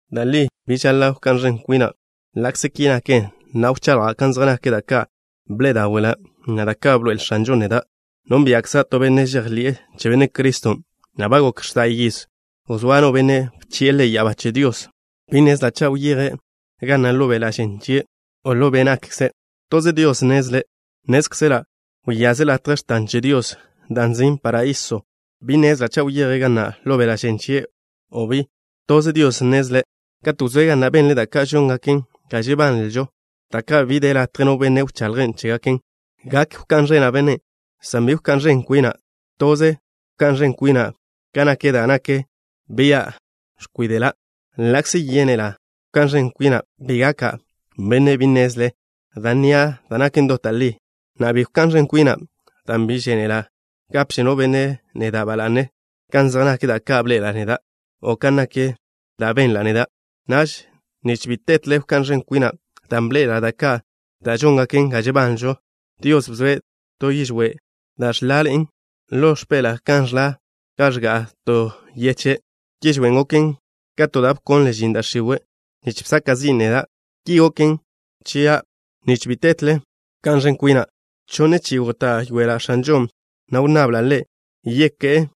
Da' li bi žaḻa' wká'n ẕen kwina'. Ḻa'kze ki naken, na'a wchaḻja' kan zej nak da' ka' bḻe'e dáwe'la', na' da' ka' bḻoe'el X̱anžon' neda'. Nónbia'kza' to benne' žejḻi'e che Benne' Criston', na' ba gok x̱da' yiz wzóa no benne' bchi'e ḻe' ya'abá che Dios. Bi nnezla' cha' wyeje' ga na' ḻo beḻa' žen chie', o ḻo be' nakkze'. Toze Dios nnezle'. Nnézkzela' wyaze' latje x̱tan che Dios, da' nzin' paraíso. Bi nnezla' cha' wyeje' ga na' ḻo beḻa' žen chie', o bi. Toze Dios nnezle'. Katen' wzóe' ga na', benle' da' ka' žóngaken ga žebanlžo, da' ka' bi de latje no benne' wchaḻje' chégaken. Gak wká'n ẕena' bennen', san bi wká'n ẕen kwina'. Toze wká'n ẕen kwina' kan nak da' nak bia' ẕkwíde'la'. Ḻa'kze yénela' wká'n ẕen kwina', bi gaka' benne' bi nnezle, dan' nnia' da' nak dot da' li. Na'a, bi wká'n ẕen kwina' dan' bi žénela' gapže no benne' neda' ba la'ne kan zej nak da' ka' bḻe'ela' neda', o kan nak da' benla' neda'. Naž, nich bi tetle wká'n ẕen kwina' dan' bḻe'ela' da' ka' da' žóngaken ga žebanlžo, Dios bzoe' to yižwé' da' žlaḻe'en ḻo x̱peḻa'a kan žla gan ẕga'a to yeche'. Yižwén' goken ka to da' bkonle žin da' x̱iwe', nich bsaka' zin' neda'. Ki goken chia' nich bi tetle wká'n ẕen kwina'. Chonne chi'i góta'yoela' X̱anžon', na' wnnabla' Ḻe' yeké'e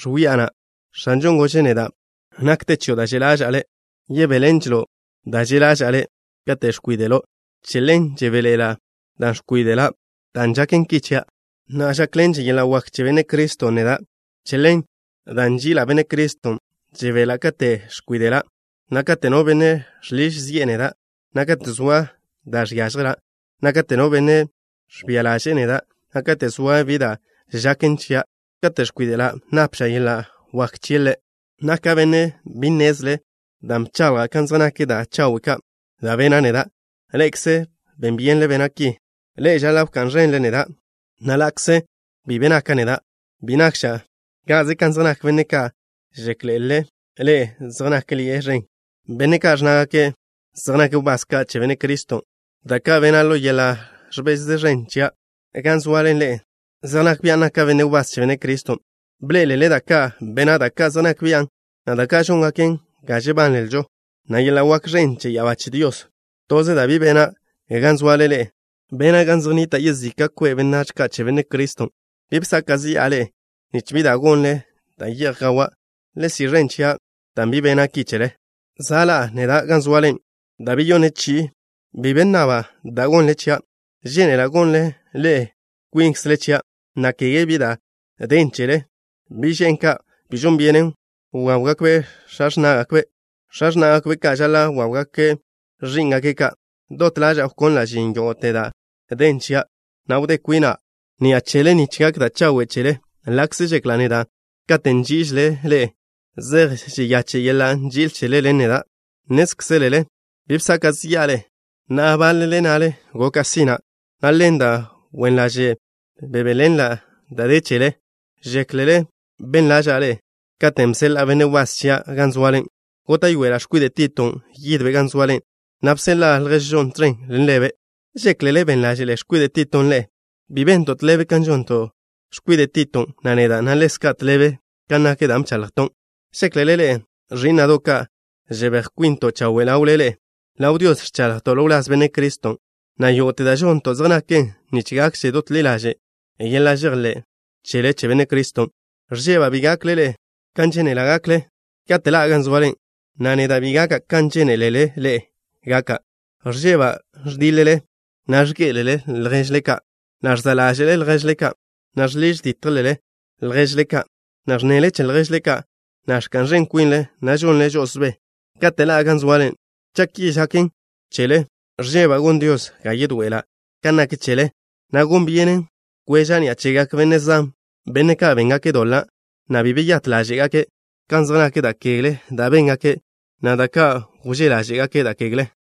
x̱wi'a na'. X̱anžon' gože' neda': “Nakte chio' da' že' ḻaža'a le'. Yebéḻenželo' da' že' ḻaža'a le' kate' ẕkwíde'lo'.” Che ḻen, žebéḻe'ela' dan' ẕkwíde'la'. Dan' žaken ki chia', na' žákḻenže yeḻa' wak che Benne' Criston' neda'. Che ḻen, dan' nži'ila' Benne' Criston', žebela' kate' ẕkwíde'la', na' kate' no benne' žḻiž zi'e neda', na' kate' zoa da' žiážjela', na' kate' no benne' ẕbia ḻaže'e neda', na' kate' zoa bi da' žaken chia'. Kate' ẕkwíde'la', napža' yeḻa' wak chie' Ḻe'. Naka' benne' bi nnezle dan' bchaḻja' kan zej nak da' chawe' ka' da' bena' neda'. Ḻe'ekze ben byenle bena' ki. Ḻe'e žaḻa' wká'n ẕenle neda', na' ḻa'kze bi be naka' neda', bi nakža' ka'ze kan zej nak benne' ka' žéklele ḻe'e zej nákḻi'e ẕen, benne' ka' ẕnnázegake' zej nake' wbás ka' che Benne' Criston'. Da' ka' bena' ḻo yeḻa' ẕbez ẕen ḻaže' chia' gan zoale ḻe'e zej nak bian' naka' benne' wbás che Benne' Criston'. Bḻé'elele da' ka' bena', da' ka' zej nak bian', na' da' ka' žóngaken ga žebanlžo, na' yeḻa' wak ẕen che ya'abá che Dios. Toze da' bi bena' gan zoale ḻe'e da' bena' gan zej nnita' yezika' kwe' benách ka' che Benne' Criston'. Bi bsaka' zi'a ḻe'e nich bi da' gonnle da' ye'j gawan'. Le si' ẕen chia' dan' bi bena' ki chele. Za' ḻa'a neda' gan zoale da' beyonne chi'i. Bi be nnaba' da' gonnle chia'. Žénela' gonnle ḻe'e kwinkzle chia', na' kege bi da' den chele. Bi' že'n ka', bi žon byenen wáwgakbe' x̱a x̱ná'gakbe'. X̱a x̱ná'gakbe' ka' žaḻa' wáwgake' ẕí'ngake' ka'. Dot ḻaža'a wkonla' žin yógo'te da' den chia', na' wdé kwina' ni'a chele nich gak da' chawe' chele, ḻa'kze žekla' neda' kate' nží'ižela' ḻe'e, zej žeyache' yeḻa' nži'il chele ḻen neda'. Nnézkzelele bi bsaka' zi'a ḻe'e. Na'a, báḻele nnale goka' sina', na' ḻen da' wen ḻaže' bebéḻenla' da de chele. ¿Žéklele ben ḻáže'la' ḻe'e katen' bseḻa'a benne' wbás chia' ka' gan zoale? Góta'yoela' x̱kwide' Titon' yidbe' gan zoale, na' bseḻa'a lježžon' tẕen ḻen ḻebe'. ¿Žéklele ben ḻáže'le x̱kwide' Titon' ḻe'e? ¿Bi bento' tḻebe kan žonto' x̱kwide' Titon', na' neda', na' ḻezka' tḻebe kan nak dan' bchaḻjton'? ¿Žéklele ḻe'e, ẕí'na'do' ka', žebéj kwinto' chawe' ḻawle ḻe'e? Ḻaw Dios ẕchaḻjto' ḻo wláz Benne' Criston', na' yógo'te da' žonto' zej naken nich gakže dot ḻi ḻaže' yeḻa' žejḻé' chele che Benne' Criston'. Ẕžeba' bi gakle ḻe'e kan žénela' gakle kate' ḻa'a gan zoale, na' neda' bi gaka' kan žénelele ḻe'e gaka'. Ẕžeba' ẕdíḻele, na' ẕgé'elele lježle ka', na' ẕža'le lježle ka', na' žḻiž dítjele lježle ka', na' ẕnnele che lježle ka', na' ẕka'n ẕen kwinle, na' žonle žo'osbé. Kate' ḻa'a gan zoale, cha' ki žaken chele, ẕžeba' gon Dios ga yedoe'ela' kan nak chele, na' gon byenen kweža' ni'a chegak benne' zan, benne' ka' béngake' doḻa', na' bi beyát ḻáže'gake' kan zej nak da' kegle da' béngake', na' da' ka' wzé ḻáže'gake' da' kegle.